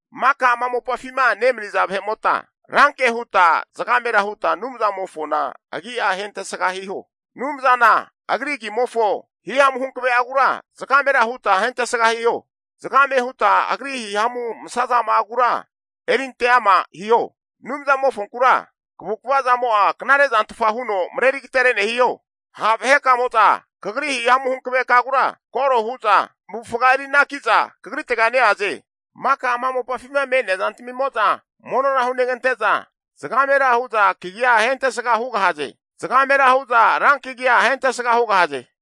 Maka ama mopafima nemaniza vahe'mota, ranke huta zagamera huta Anumzamofona agi'a ahentesga hiho! Anumzana Agri agimofo hihamu hanave'agura zagamera huta agi'a ahentesga hiho. Zgame huta Agri hihamu masazama'agura erinte ama hiho! Anumzamofonkura, kavukva zamo'a knare zantfa huno mareri agatere'ne hiho. Ha' vahekamo'za Kagri hihamu hankavegura koro hu'za zamavufaga eri anaki'za Kagritega neaze. Maka ama mopafima me'nea zantamimo'za monora hunegante'za, zagamera hu'za kagia ahentsga hugahaze. Zgamera hu'za rankagia ahentesga hugahaze.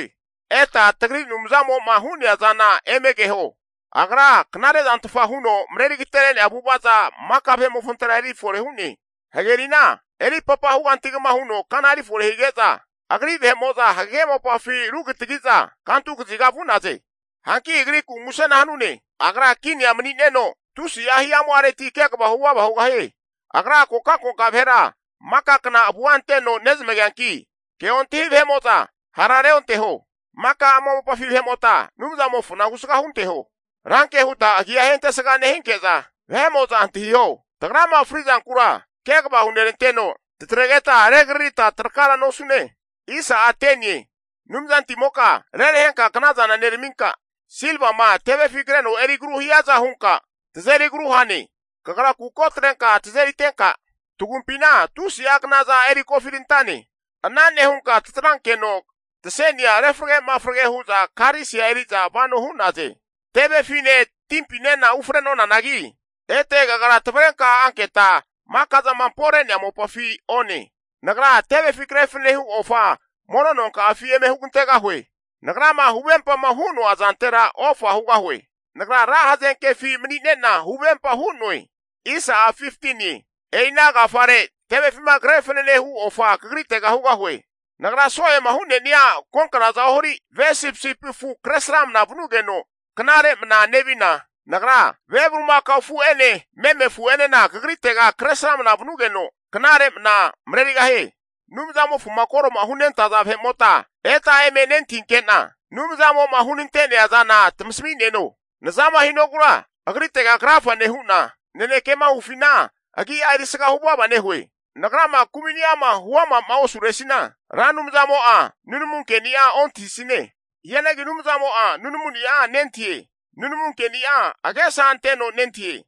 Eta tagri Anumzamo'ma hu'nea zana eme keho. Agra knarezantfa huno mareri agatere'nea avu'avaza, maka vahe'mofontera eri fore hu'ne. Hagerina eripapa hugantigama huno kana erifore hige'za, Agri vahe'mo'za hagege mopafi rugitagi'za kantukaziga vu'naze. Hanki Agriku musena hanune. Agra kinia mani'neno tusi'a hihamu'areti kegava huvava hugahie. Agra kokankoka vahera maka kna avua anteno nezmageanki, ke ontahi vahe'mo'za hara reonteho. Maka ama mopafi vahe'mota Anumzamofona husga hunteho. Ranke huta agia ahentesga nehinke'za vahe'mo'za antahiho. Tagrama fri'zankura kegava huneranteno, tatregeta regaririta trakara nosune. Anumzantimoka rerahenka knazana neraminka, silvama tevefi kreno eri agru hiaza hunka tazeri agru hane. Kagra kuko atrenka tazeritenka, tagumpina tusi'a knaza eri kofirantane. Ana nehunka tatrankeno tasenia refrage mafrage hu'za karisia eri'za vano hu'naze. Tevefine timpinena ufre'nonanagi, ete Kagra tavrenka anketa maka'zama ampore'nea mopafi one. Nagra tevefi kre fanane hu ofa mono nonka'afi eme hugantegahue. Nagrama huvempama hu'noa zantera ofa hugahue. Nagra ra hazenkefi mani'nena, huvempa hu'noe. E'ina agafare tevefima kre fanene hu ofa Kagritega hugahue. Nagra so'ema hu'nenia agonknaza ohari ve sipisipi afu kresramna vanugeno knare mna nevina, Nagra ve bulimakao afu'ene meme afu'enena Kagritega kresrama vanugeno, knare mna marerigahie. Anumzamofoma koro'ma hunentaza vahe'mota, eta eme nentahinke'na Anumzamo'ma hunante'nea zana tamasmi'neno. Nazama hinogura Agritega krafa nehu'na, nanekema hufina agi'a erisga huvava nehue. Nagrama kumini'ama huama'ma osuresina, Ra Anumzamo'a nunamunkeni'a ontahisine. Hianagi Anumzamo'a nunamuni'a nentahie. Nunamunkeni'a agesa anteno nentahie.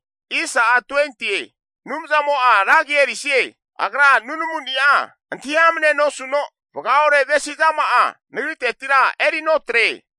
Anumzamo'a ra agi erisie. Agra nunamuni'a antahi amnea nosuno vaga ore avesizama'a nagritetira eri notre.